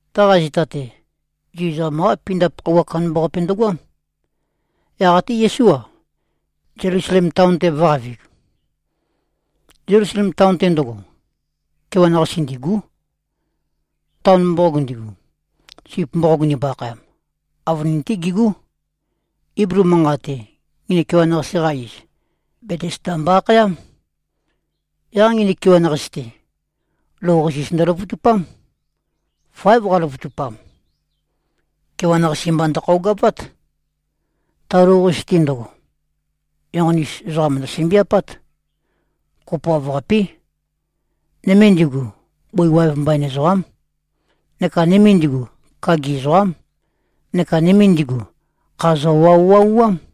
Taqa zita-te, Zu ezoqam-qá pindap khøuwa kandambaqape ndøgoám. Yaq até Yesú-a, Zelusalem taon-te vø̄qavig. Zelusalem taon-te ndøgo, kewan-qasi ndîgú. Taon mboqog ndigu, Sip mboqog ndimbo-akhayam, avønin-té gigú. Iblu manqat-te, nginik kewan-qasi-qa iz, Betesda mbo-akhayám. Yaq nginik kewan-qasi-te, lou-qasis ndøløvøtupám. Fáev qaløvøtupam. Kewan-qasi mba ndøkhøogavát. Ta lou-qasis-te ndøgo, enqoni-us ezoqa mo꞉sømbiapát. Kopoav-qapí. Nøme ndigu, bøi waev mbain ezoqám, neka nøme ndigu, kagi ezoqám, neka nøme ndigu, kha zøwauwauám.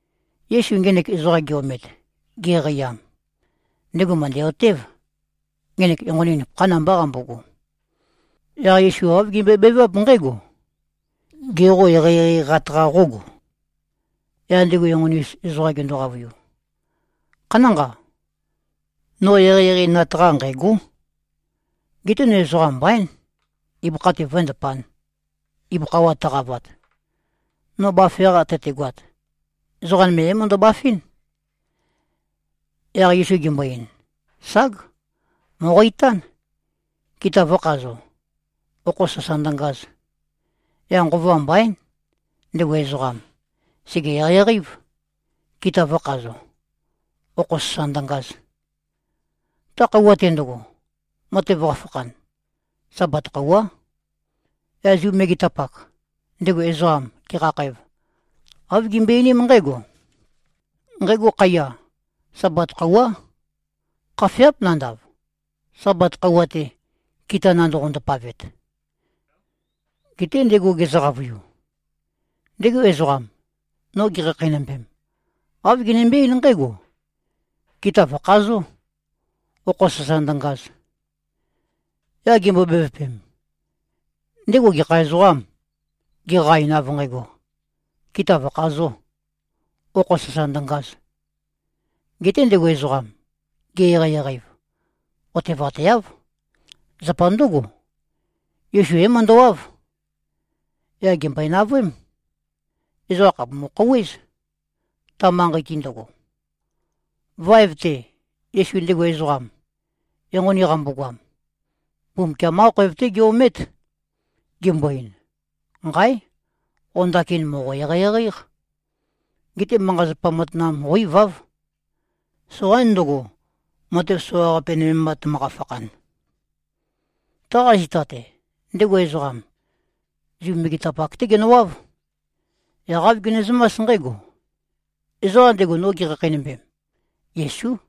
Yesu ngenek ezoqam ge-omet, geqeiam, ndego mø̀ndæ-otév, ngenek enqoni nupøkhán mbá qambogo. Yaq Yesu āv gembøebeváp nqǽgo, “Gê, qo eqeieqeiqat-qa qógo?” Yaq ndego enqoni-us ezoqam gendo-qavøiu, “Khanánqa. No eqeieqeinat-qa nqæ̂gó. Geté no ezoqam mbaín, ibøkha-te vǿendapān, ibøkha wa tøqavat. No bafe-qa tøtegoat, ezoqa nøme é-møndøbafɨ́n.” Yaq Yesu gembo-ein, “Ság. Mòqo-itán, kita vø̄khazo, okho sasa ndøngaz!” Yaq nqova mbaín. Ndego ezoqam, sège-eqeieqei-év, kita vø̄khazo, okho sasa ndøngaz. Ta khøuwa-te ndøgo, matev qafakhan, Sabat khøuwá. Yaq Zu megetapak, ndego ezoqam gekhakhæv, āv gimbøe-einím nqǽgo, “Nqægo khaiya, Sabat khøuwá. Khafeáp nandav, Sabat khøuwa-te, kita nandoqo-ndapavet.” Geté ndego gezø-qavøiu, “Ndego ezoqam, no gekhakheinømbem, āv genømbe-eín nqǽgo, ‘Kita vø̀khazó, okho sasa ndøngaz!’” Yaq gimbo-bevøpem, “Ndego gekha ezoqâm, geqa-ein av nqægo, ‘Kita vø̀khazō, okho sasa ndøngaz!’?” Geté ndego ezoqam, ge-eqeieqei-ev, otevateáv. Zapa ndǿgo, Yesu é-møndøwáv. Yaq gèmbøe-navøém. Ezoqa khàpumu-khouwéz, ta manqei-te ndøgo. Vaev-te, Yesu ndego ezoqam, enqoni qambogoam, Mbumbukiam-qá khoev-té ge-omét, gembo-ein, “Nqáe! Qo ndakin mòqo-eqeieqei-éq. Geté manqa-zapa matanam qó-iváv. Soqaín ndøgo, matev soqaqape nøme mba tømøqa-fakhan.” Taqa zita-te, ndego ezoqam, Zu megetapak-té genøwáv. Yaq āv gemezømás nqǽgo, “Ezoqam ndego, no gekhakheinømbem, Yesú.”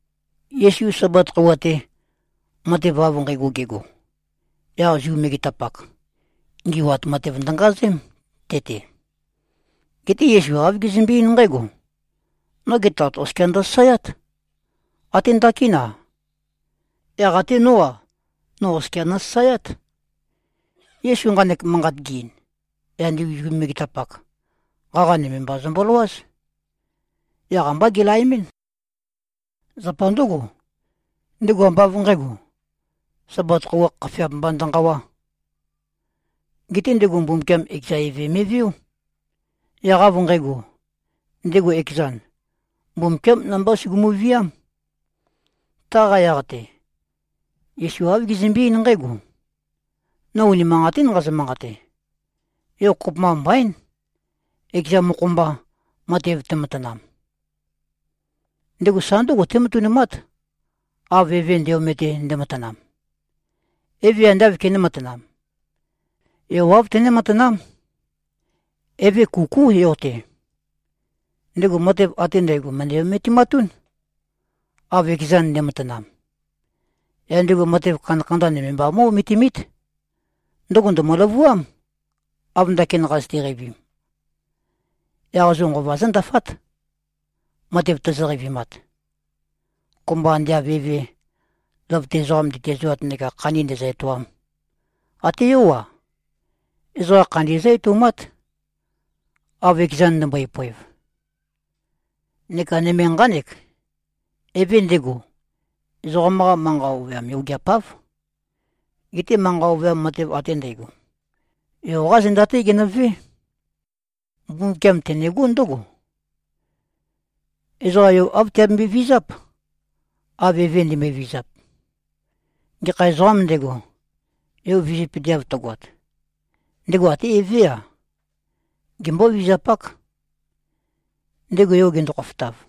Yesu Sabat khøuwa-te, matev av nqægo gego, yaq Zu megetapak, ngi꞉wat matev ndøngazém, te-te. Geté Yesu āv gezømbe-eín nqǽgo, “Noge Tat oskia ndøsasaeát. Até ndakín-a. Yaq até nó-a, no oskia nosasaeát.” Yesu nqanek manqat ge-ein, yaq ndigu Zu megetapak, qaqa nøme mba zømboløwáz. Yaq ambá gelaemɨ́n. Zapa ndǿgo, ndego ambá av nqǣgo, Sabat khøuwa khafeap mba ndønqawá. Geté ndego Mbumbukiam ekeza eve me꞉veó. Yaq av nqægo, ndego ekezan, Mbumbukiám namba sugumu-víam. Taqa yaq-te, Yesu āv gezømbe-eín nqǽgo, “No unimanqatín nqazø-manqate. Yo kopømba mbaín, ekeza mokho-mba, matev tematanam. Ndego sa ndǿgo tématønumát, av Eve nde-omete, ndematanam. Eve ande āv kené-matanām, Yo āv tené-matanám. Eve kukú Yo-te. Ndego matev ate ndægo mø̀ndæ-ometimatún, av ekezan nde꞉matanam. Yaq ndego matev kandakanda nøme mba mó꞉-ometimít. Ndøgo ndø̀mø-løvuám, av ndakin qazøte-qeivim. Yaq zo nqova zǿndafát, matev tozo-qeivimat. Kopømba ande av eve, løvøte ezoqam ndetiæzoat neka khandi ndēzø̄-ētōām, até Yó-a, ezoqa khandi zǿ-etoumát, av ekezan ndømbøe-poev. Neka nøme nqánek: Eve ndego, ezoqam-qa manqa ovøyam yogeapáv. Geté manqa ovøyam matev ate ndægo, Yo-qá zenda-té genøvé. Mbumbukiam tenegó ndǿgo: Ezoqa Yo āv tiabembøe-vizáp, av Eve ndimbøe-vizap. Gekha ezoqām ndego, Yo vizøpøteav tøgoat, ndego até Evé-a, gembó-vizapák, ndego Yo gendo-khofotav.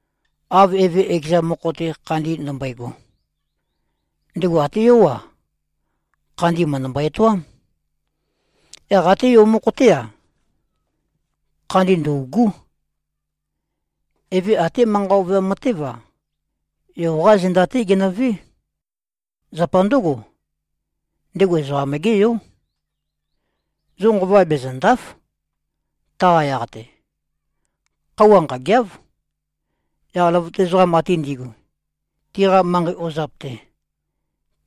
Av Eve ekeza mokho-te khandi ndømbøego, ndego até Yó-a, khandi mø̀ndømbo-etoám. Yaq até Yó mokho-té-a, khandi ndø̂ugú. Eve até manqa ovøyam matév-a, Yo-qá zenda-té genøvé. Zapa ndǿgo, ndego Ezoqam-gé Yó. Zo nqova bezø̀nda᷄f, taqa yaq-te. Khøuwa nqâgeáv. Yaq løvøte ezoqam ate ndi꞉gu, tiqa manqei ozap-te,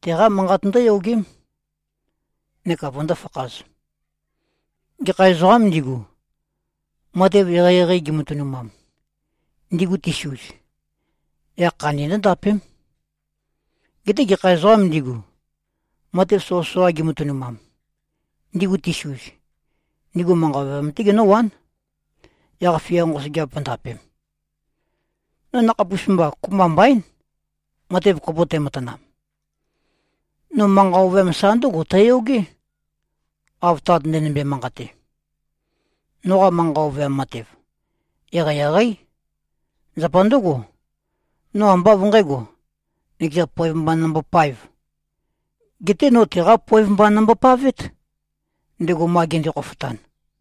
teqá manqat ndǿyogém, neka vøndó-fakhāz. Gekha ezoqām ndigu, matev eqeieqei gimatønumam, ndigu tisuz, yaq khandi ndǿndapém. Geté gekha ezoqām ndigu, matev soqøsoqa gimatønumam, ndigu tisuz, ndigu manqa ovøyam-té genǿwán, yaq-fia nqosøgeap vǿndapēm. No nakhapus-mba, kopømba mbaín, matev kopo tæmatanam. No manqa ovøyam sa ndǿgo tæyogé, av Tat ndenømbe-manqate. Noqa manqa ovøyam matev, eqeieqeí. Zapa ndǿgo, no ambá av nqǣgo, nøkeza poev mba nombopaēv. Geté no teqá poev mba nombopavét, ndego ma gende-khofotan.”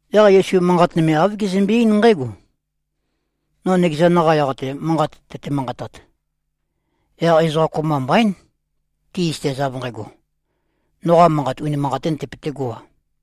Yaq Yesu manqat nøme āv gezømbe-eín nqǽgo, “No nøkezan-qa yaq-te manqat tøte-manqatat, yaq ezoqa kopømba mbaín, ti꞉zøtez av nqægo, noqa manqat unimanqatín tøpøtégo-a.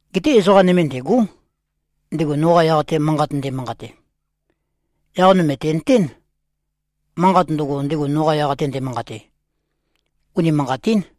Geté ezoqa nøme ndêgó, ndego noqa yaq-te manqat nde꞉manqate. Yaq no mø̀tenøtén, manqat ndøgo, ndego noqa yaq-te nde꞉manqate, unimanqatín.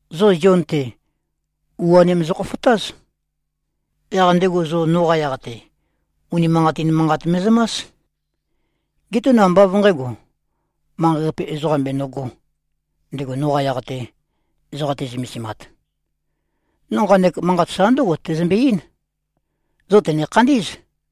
Zo Zion-te, u-anim zokhofotáz. Yaq ndego zo noqa yaq-te, unimanqatin manqat me꞉zømás. Geté no ambá av nqǣgo, manqei-qape ezoqam benøgō, ndego noqa yaq-te, ezoqa te꞉zømesimat. No nqanek manqat sa ndǿgo tæzømbe-eín, zo tø̀ne-khandí꞉z.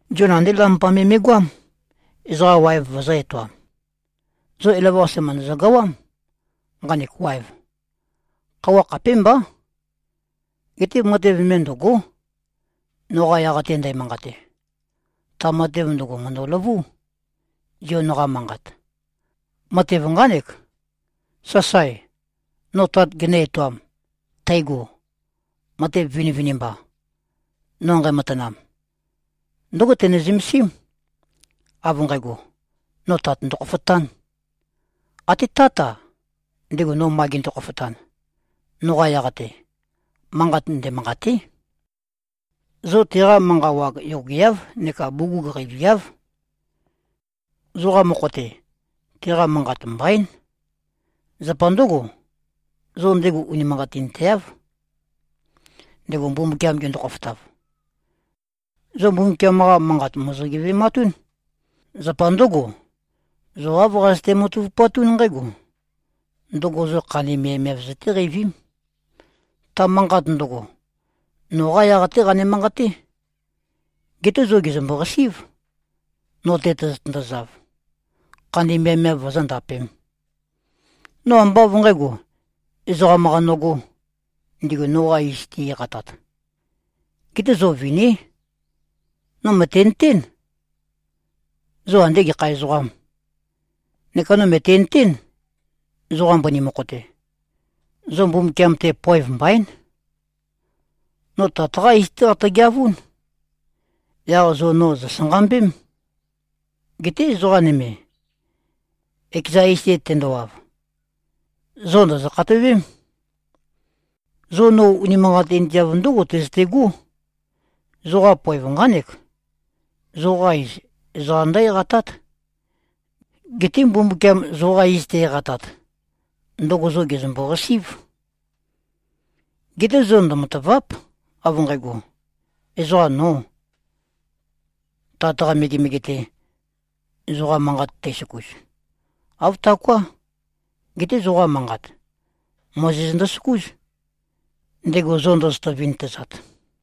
Zion andé lampa me me꞉goám, ezoqa waev vøzø̄-etoam. Zo elavøqase mø̀ndøzø-gawám, nqanek waev. Khøuwa khapémbá. Geté matev nøme ndø̂gó, noqa yaq-te ndæmanqate. Ta matev ndøgo mø̀ndøløvú, Zion-qa manqat. Matev nqánek, sasae, no Tat genø-etoam, tægo. Matev vinivinimba, no nqæmatanam, ndǿgo tøne-zømesím, av nqægo, no Tat ndokhofotān. Até Tát-a, ndego no ma gende-khofotan, noqa yaq-te, manqat ndemanqâté. Zo teqa manqa wag yogeáv neka bugug qeiviáv. Zoqa mokho-te, teqa manqat mbaín. Zapa ndǿgo, zo ndego unimanqatinteáv, ndego Mbumbukiam gendo-khofotav. Zo Mbumbukiam-qa Manqat mòzo-geve꞉matún. Zapa ndǿgo, zo āv qazøte-matavupatún nqǽgo: Ndøgo zo khandi miavmiav zøtéqeivím. Ta manqat ndøgo, noqá yaq-té qane-manqaté. Geté zo gèzømbo-qasí꞉v, no-te tozotøndozav, khandi miavmiav vozóndapēm. No ambá av nqǣgo, ezoqam-qa nogō, ndigu noqa iz ti-eqatāt. Geté zo viní. No mø̀tenøtén, zo andē gekha ezoqām. Neka no mø̀tenøtén, zoqa mbøni mokho-te, zo Mbumbukiam-te poev mbaín. No Tat-qá iz-té qatøgeavún. Yaq zo no zosanqambém. Geté ezoqa nøme, ekeza iz-te tendowav, zo ndòzo-khatowém. Zo no unimanqatinteav ndǿgo tøzøtegó, zoqa poev nqánek. Zoqa iz, ezoqa ndǿ-eqatát. Geté Mbumbukiam zoqa iz te-eqatat, ndøgo zo gèzømbo-qasí꞉v. Geté zo ndømatàva᷄p, av nqægo, ezoqam nō, Tat-qa megemege-te, zoqa manqa tæsøkus. Āv taoká. Geté zoqa manqa, Mozes ndøsøkús, ndego zo ndozoto-vintøzat.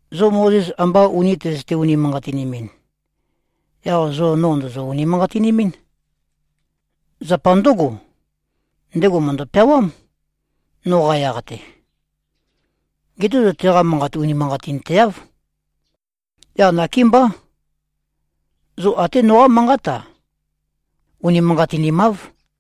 Zo Mozes amba uni tøzøte-unimanqatinimin, yaq zo no ndòzo-unimanqatinimín. Zapa ndǿgo, ndego mø̀ndø-peawám, noqa yaq-te. Geté zo teqa manqat unimanqatinteáv. Yaq nakémbá, zo até noqá manqát-a, unimanqatinimáv.”